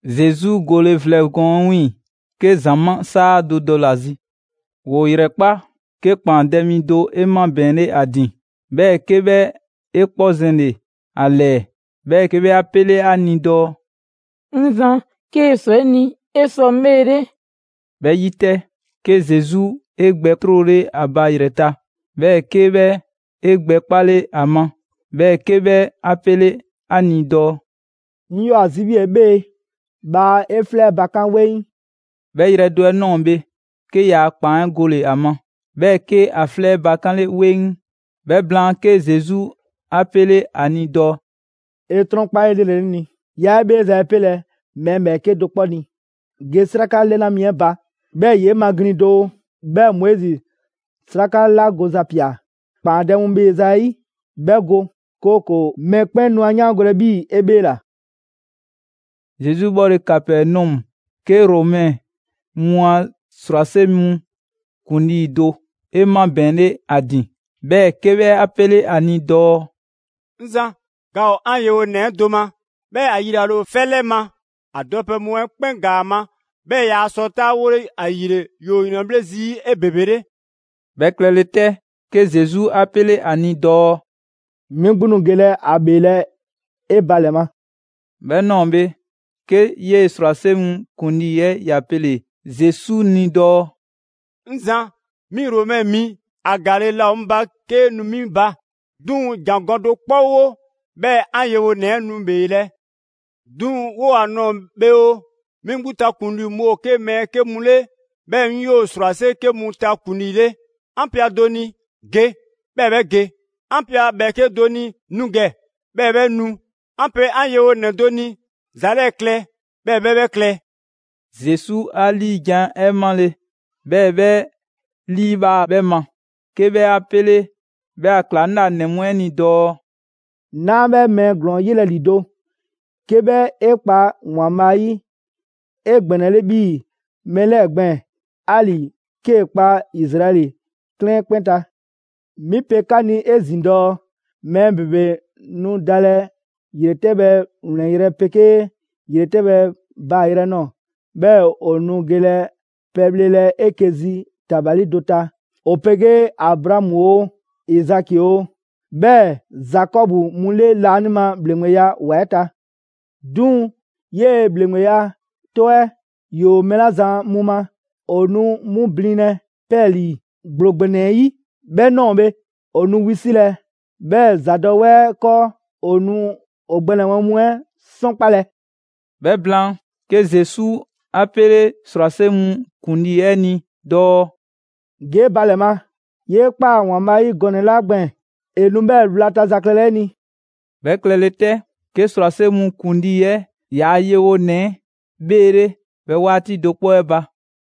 Zesu gole vlɛ gɔɔn 'ɛ 'wiiŋ‑, 'ke ‑zamaa' 'saa do dɔle‑ ‑a zi. ‑Woo ‑yrɛkpa', 'ke ‑kpaandɛ' mi do 'e 'mabɛɛnle ‑a ‑din, 'bhɛɛ‑ 'ke 'bhɛ 'e 'kpɔ zɛnle‑ ‑a 'lɛɛ, 'bhɛɛ‑ 'ke 'bhɛ 'a 'pele 'a ni dɔɔ: «'Ŋ Zan, 'kee‑ ‑swa 'e ni, 'e sɔ 'ŋ 'bheele.» 'Bhɛ 'yi 'tɛ, 'ke Zesu 'e gbɛ 'trole ‑a ba ‑yrɛ ta; 'bhɛɛ‑ 'ke 'bhɛ 'e gbɛ 'kpale ‑a ma, 'bhɛɛ‑ 'ke 'bhɛ 'a pele‑ 'a ni dɔɔ: «'Ŋ 'yoo‑ ‑a zi 'bhii‑ 'e 'bhee, bhaa 'e 'flɛ bakan' 'weŋ!» 'Bhɛ yrɛ do 'ɛ ꞊nɔɔ bhe, 'ke ‑yaa' ‑kpaan 'ɛ gole‑ ‑a ma, 'bhɛɛ‑ 'ke ‑a 'flɛ bakanle 'weŋ. 'Bhɛ blaan, 'ke Zesu 'a 'pele 'a ni dɔɔ: «'E 'trɔnkpa 'elrele 'ŋ ni: 'Yaa 'e 'bheeza‑ 'ɛ 'pelɛ‑ mɛɛ ‑bhɛɛke' do 'kpɔ ni. Ge 'sraka 'lɛna mi 'ɛ ba, 'bhɛɛ‑ ‑yee' maglin‑ doo, 'bhɛɛ‑ Moizi 'sraka 'la goza ꞊pia ‑kpaandɛ' mu ‑bheeza' 'ɛ 'yi, 'bhɛ go, 'kooko‑ mɔkpɛn' nu 'a 'yaango‑ 'bhii‑ 'e 'bheela‑.» Zesu 'bhɔle‑ Kapɛnɔmu, 'ke Romɛ mu a ‑srwase' mu ‑kuŋlii do 'e 'mabɛɛnle ‑a ‑din, 'bhɛɛ‑ 'ke 'bhɛ 'a 'pele‑ ‑a ni dɔɔ: «'Ŋ Zan, ga ‑o 'an yewonɛ 'ɛ do ma, 'bhɛɛ‑ ‑a yilale ‑o 'fɛ 'lɛ ma; ‑a dɔpɛ mu 'ɛ 'kpɛn ‑gaa ‑a ma, 'bhɛɛ‑ yaa sɔ 'taawole, ‑ayile ‑yoo ‑yrɛnbhle' zii' 'ebebele.» 'Bhɛ klɛle 'tɛ, 'ke Zesu 'a 'pele 'a ni dɔɔ: «'Mi 'gbu nu gelɛ ‑a ‑bheelɛ' 'e ba ‑lɛ ma.» 'Bhɛ ꞊nɔɔ bhe, 'ke 'yee‑ ‑srwase' mu ‑kuŋlii 'ɛ ‑ya pele‑ Zesu ni dɔɔ: «'Ŋ Zan, 'mi Romɛ mi, ‑a ‑gaale' laa ‑o 'ŋ ba 'kee‑ nu 'mi ba. 'Duŋ‑ ‑jangɔ' do 'kpɔ 'wo, 'bhɛɛ‑ 'an yewonɛ 'ɛ nu ‑bheelɛ'. 'Duŋ‑ 'woo‑ ‑a ꞊nɔɔ bhe oo, 'mi 'gbu ta ‑kuŋlii mu ‑o 'ke mɛɛ 'ke mu 'le, 'bhɛɛ‑ 'ŋ 'yoo‑ ‑srwase' 'ke mu ta ‑kuŋlii 'le. 'An pe ‑a do ni: ‹Ge!› 'Bhɛɛ‑ 'bhɛ ge; 'an pe ‑a ‑bhɛɛke' do ni: ‹Nu ‑gɛ!› 'Bhɛɛ‑ 'bhɛ nu; 'an pe 'an yewonɛ 'ɛ do ni: ‹‑Za 'lɛɛ‑ klɛ!› 'Bhɛɛ‑ 'bhɛ 'bhɛ klɛ.» Zesu 'a 'liijan‑ 'ɛ 'male‑, 'bhɛɛ‑ 'bhɛ 'liibhaa‑ 'bhɛ ma, 'ke 'bhɛ 'a 'pele 'bhɛ a ‑klaŋlanɛ mu 'ɛ ni dɔɔ: «'Naa 'bhɛ mɛɛ ‑glɔɔn 'yelɛ‑ ‑lido' 'ke 'bhɛ 'e kpa ‑Waanbhaa' 'yi 'egbɛnɛle 'bhii‑ mɛɛ 'lɛɛ‑ gbɛɛn‑, 'ali‑ 'kee‑ kpa Izraɛli 'klɛɛn 'kpɛn ta. 'Mi pe 'ka ni 'ezin‑ dɔɔ: Mɛɛ ‑bebe nu dalɛ ‑yretɛbhɛ ‑wlɛnyrɛ' 'pegee ‑yretɛbhɛ baayrɛ ꞊nɔɔ, 'bhɛɛ‑ ‑o nu gelɛ pɛbhlelɛ 'eke‑ zi ‑tabali do ta ‑o 'pegee Abraamu oo, Izaki oo, 'bhɛɛ‑ Zakɔbu mu 'le laanima ‑bhleŋgbeya ‑wa 'ɛ ta. 'Duŋ‑ 'yee‑ ‑bhleŋgbeya 'tɔ 'ɛ ‑yoo mɛɛ 'la zan mu ma, ‑o nu 'mu blinlɛ 'pɛɛlii‑ ‑gblo ‑gbɛnɛ 'ɛ 'yi. 'Bhɛ ꞊nɔɔ bhe, ‑o nu wisilɛ, 'bhɛɛ‑ ‑zadɔwɛɛ 'ɛ 'kɔɔ, ‑o nu ‑o gbɛnɛbhɛ mu 'ɛ 'sɔnkpalɛ.» 'Bhɛ blaan, 'ke Zesu 'a 'pele ‑srwase' mu ‑kuŋlii 'ɛ ni dɔɔ: «Ge 'e ba ‑lɛ ma. 'Yee ꞊kpaa ‑Waanbhaa' 'yi gɔnɛ‑ 'la gbɛɛn‑, ‑e nu 'bhɛɛ‑ 'wlata‑ za klɛlɛ 'e ni.» 'Bhɛ klɛle 'tɛ, 'ke ‑srwase' mu ‑kuŋlii 'ɛ ‑yaa' yewonɛ 'ɛ 'bheele 'bhɛ 'waati do 'kpɔ 'ɛ ba.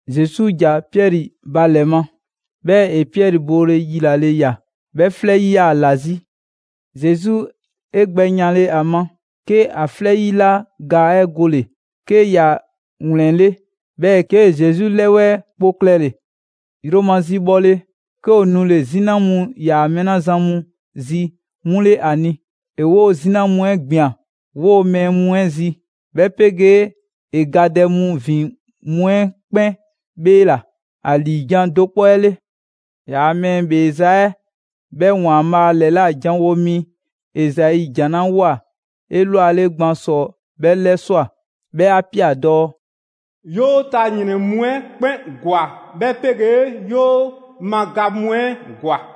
Zesu ‑ja Piɛri ba ‑lɛ ma, 'bhɛɛ‑ ‑e Piɛri boole yilale ꞊ya: 'Bhɛ 'flɛ 'yi 'yaa‑ ‑la 'zi. Zesu 'e gbɛ yanle ‑a ma, 'ke ‑a 'flɛ 'yi 'la ga 'ɛ gole‑; 'ke ‑ya ‑wlɛnle', 'bhɛɛ‑ 'kee‑ Zesu ‑lɛwɛɛ' kpo klɛle‑. Yromazi bhɔle, 'ke ‑o nule‑ 'zina mu ‑yaa mɛɛ 'la zan mu zi 'mu 'le ‑a ni. ‑E 'woo‑ 'zina mu 'ɛ ꞊gbian 'woo‑ mɛɛ mu 'ɛ zi, 'bhɛ 'pegee ‑e gadɛ mu ‑vin mu 'ɛ 'kpɛn 'bheela‑ ‑a ‑liijan' do 'kpɔ 'ɛ 'le. ‑Yaa' mɛɛ ‑bheeza' 'ɛ 'bhɛ ‑Waanbhaa' ‑lɛla' janwo mi Ezai jan 'la ꞊woa 'elwale gban ‑sɔ 'bhɛ 'lɛswa꞊: 'Bhɛ 'a ‑pia dɔɔ: «‑Yoo' ta ‑yrɛn mu 'ɛ 'kpɛn ‑gwa, 'bhɛ 'pegee ‑yoo ma ga mu 'ɛ ‑gwa.»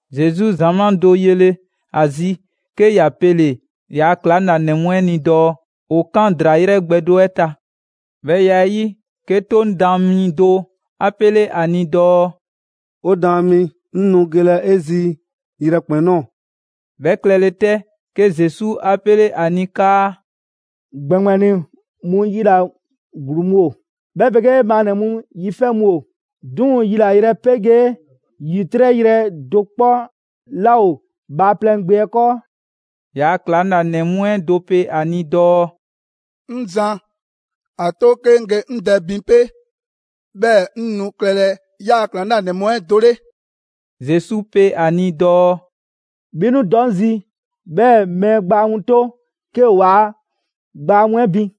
Zesu ‑zamaa' do yele‑ ‑a zi, 'ke ‑ya pele‑ ‑yaa' ‑klaŋlanɛ mu 'ɛ ni dɔɔ ‑o 'kan ‑draa 'yrɛ gbɛ do 'ɛ ta. 'Bhɛ ya 'ɛ 'yi, 'ke 'Toŋ daan mi do 'a 'pele 'a ni dɔɔ: «'O Daan mi, 'ŋ nu gelɛ 'e zi yrɛkpɛn‑ ꞊nɔɔ.» 'Bhɛ klɛle 'tɛ, 'ke Zesu 'a 'pele ‑a ni 'kaa: «‑Gbɛŋgbɛni mu yila‑ ‑gluu mu ‑o, 'bhɛ 'pegee maannɛ‑ mu yi 'fɛ mu ‑o, 'duŋ‑ yilayrɛ 'pegee ‑yitrɛ' yrɛ do 'kpɔ 'laa ‑o Bhaaplɛŋ Gbe 'ɛ 'kɔɔ.» ‑Yaa' ‑klaŋlanɛ mu 'ɛ do pe ‑a ni dɔɔ: «'Ŋ Zan, ‑a 'to 'ke 'ŋ ge 'ŋ dɛ bin 'pe, 'bhɛɛ‑ 'ŋ nu klɛlɛ 'yaa‑ ‑klaŋlanɛ mu 'ɛ do 'le.» Zesu pe ‑a ni dɔɔ: «'Bhi nu dɔ 'ŋ zi, 'bhɛɛ‑ mɛɛ gbaa mu 'to 'ke ‑o ‑waa' gbaa mu 'ɛ bin.»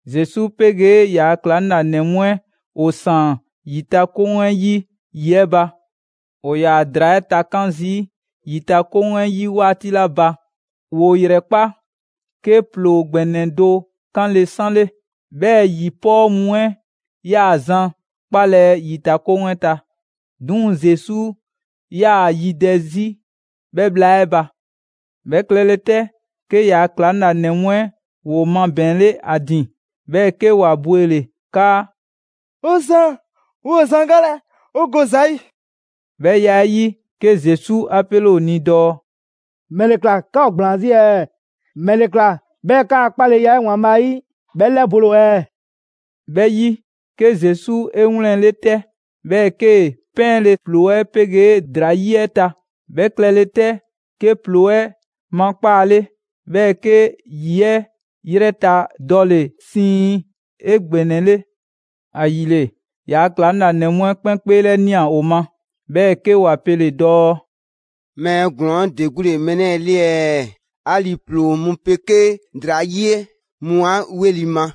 Zesu 'pegee ‑yaa' ‑klaŋlanɛ mu 'ɛ ‑o ‑saan ‑yitakoŋ 'ɛ 'yi ‑yi 'ɛ ba. ‑O ‑yaa ‑draa 'ɛ takan' zii' ‑yitakoŋ 'ɛ 'yi 'waati 'la ba, ‑woo ‑yrɛkpa', 'ke ‑ploo ‑gbɛnɛ do 'kanle‑ 'sanle. 'Bhɛɛ‑ ‑yi 'pɔɔ mu 'ɛ 'yaa‑ zan 'kpalɛ‑ ‑yitakoŋ 'ɛ ta. 'Duŋ‑ Zesu 'yaa‑ yidɛ 'zi 'bhɛ bhla 'ɛ ba. 'Bhɛ klɛle 'tɛ, 'ke ‑yaa' ‑klaŋlanɛ mu 'ɛ ‑woo mabɛɛnle 'a ‑din, 'bhɛɛ‑ 'ke ‑wa bwele‑ 'kaa: «'O Zan, 'woo‑ zan galɛ, 'o go ‑za 'yi!» 'Bhɛ ya 'ɛ 'yi, 'ke Zesu 'a 'pele ‑o ni dɔɔ: «‑Mɛle ꞊kla 'ka ‑o ‑gblaan 'zi ɛɛ? ‑Mɛle ꞊kla 'bhɛɛ‑ 'kaa‑ 'kpaleya 'ɛ ‑Waanbhaa' 'yi 'bhɛ 'lɛbole ‑o ɛɛ?» 'Bhɛ 'yi, 'ke Zesu 'e 'wlɛnle‑ 'tɛ, 'bhɛɛ‑ 'kee‑ 'pɛɛnle‑ ‑ploo 'ɛ 'pegee ‑draa 'yi 'ɛ ta. 'Bhɛ klɛle 'tɛ, 'ke ‑ploo 'ɛ makpaale, 'bhɛɛ‑ 'ke ‑yi 'ɛ 'yrɛ ta dɔle‑ siiŋ 'egbɛnɛle. ‑Ayile, ‑yaa' ‑klaŋlanɛ mu 'ɛ 'kpɛn 'kpeelɛnia ‑o ma, 'bhɛɛ‑ 'ke ‑wa pele‑ dɔɔ: «Mɛɛ ‑glɔɔn 'ɛ ‑de 'gbu ‑le mɛɛ 'lɛɛ‑ 'le ɛɛ? 'Ali‑ ‑ploo mu 'pegee ‑draa 'yi 'ɛ 'mu 'a 'weli‑ ma,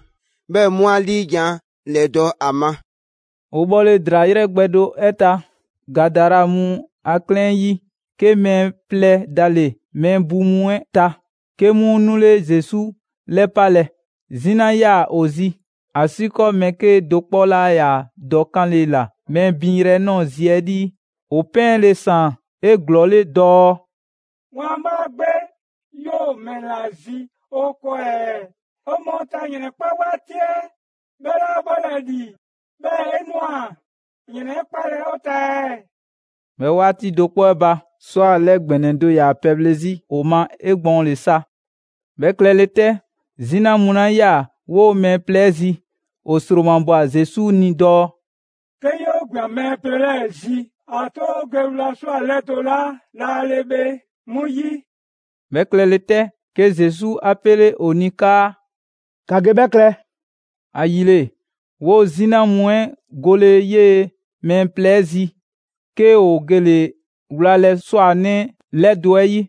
'bhɛɛ‑ 'mu 'a ‑liijan' ‑lɛdɔ' ‑a ma.» ‑O bhɔle ‑draa 'yrɛ gbɛ do 'ɛ ta, Gadara mu a 'klɛɛn 'yi, 'ke mɛɛ plɛ dale‑ mɛɛ bu mu 'ɛ ta, 'ke 'mu 'nule Zesu 'lɛpalɛ. 'Zina ‑yaa ‑o zi, ‑asiikɔɔ mɛɛ 'kedo‑ 'kpɔ 'laa ‑yaa dɔ 'kanle‑ ‑la mɛɛ binyrɛ 'ɛ ꞊nɔɔ zi 'ɛ 'lii. ‑O 'pɛɛnle‑ ‑saan 'eglɔɔle dɔɔ: «‑Waanbhaa' Gbe, 'yoo‑ ‑mɛla zi 'o 'kɔɔ ɛɛ? 'O mɔɔ ta ‑yrɛnkpa' 'waati 'ɛ 'bhɛ 'laa bhɔlɛ ‑li, 'bhɛɛ‑ 'e ꞊nwa ‑yrɛnkpalɛ 'o ta ɛɛ?» 'Bhɛ 'waati do 'kpɔ 'ɛ ba, ꞊swa 'lɛ ‑gbɛnɛ do ‑yaa pɛbhle 'zi ‑o ma 'egbɔɔnle sa. 'Bhɛ klɛle 'tɛ, 'zina mu 'la 'yaa‑ 'woo‑ mɛɛ plɛ 'ɛ zi, ‑o ‑sromabwa Zesu ni dɔɔ: «'Ke 'yoo ꞊gbian mɛɛ plɛ 'lɛɛ‑ zi, ‑a 'to 'o ge wla ꞊swa 'lɛdo‑ 'la laale bhe 'mu 'yi!» 'Bhɛ klɛle 'tɛ, 'ke Zesu 'a 'pele ‑o ni 'kaa: «‑Ka ge 'bhɛ klɛ!» ‑Ayile, 'woo‑ 'zina mu 'ɛ gole 'yee‑ mɛɛ plɛ 'ɛ zi, 'ke ‑o gele‑ wlalɛ 'swanɛ 'lɛdo‑ 'ɛ 'yi.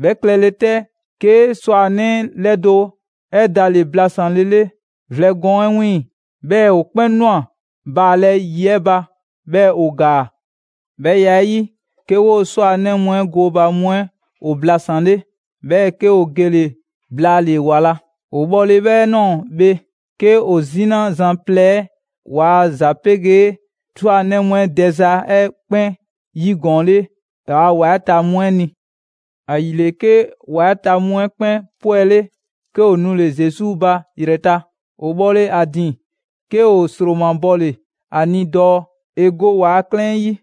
'Bhɛ klɛlɛ 'tɛ, 'ke 'swanɛ 'lɛdo‑ 'ɛ dale‑ blasanlele vlɛ gɔɔn 'ɛ 'wiiŋ‑, 'bhɛɛ‑ ‑o 'kpɛn ꞊nwa baalɛ ‑yi 'ɛ ba, 'bhɛɛ‑ ‑o ‑gaa. 'Bhɛ ya 'ɛ 'yi, 'ke 'woo‑ 'swanɛ mu 'ɛ gooba mu 'ɛ ‑o blasanle, 'bhɛɛ‑ 'ke ‑o gele‑ blaale‑ ‑wa la. ‑O bhɔle 'bhɛ ꞊nɔɔ bhe, 'ke ‑o 'zina zan plɛ 'ɛ ‑waa' ‑za 'pegee 'swanɛ mu 'ɛ dɛza 'ɛ 'kpɛn 'yigɔɔnle ‑waa' ‑wa 'ɛ ta mu 'ɛ ni. ‑Ayile, 'ke ‑wa 'ɛ ta mu 'ɛ 'kpɛn 'pwɛle, 'ke ‑o 'nule Zesu ba ‑yrɛ ta. ‑O bhɔle ‑a ‑din, 'ke ‑o ‑sromabɔle ‑a ni dɔɔ ‑e go ‑waa' 'klɛɛn 'ɛ 'yi.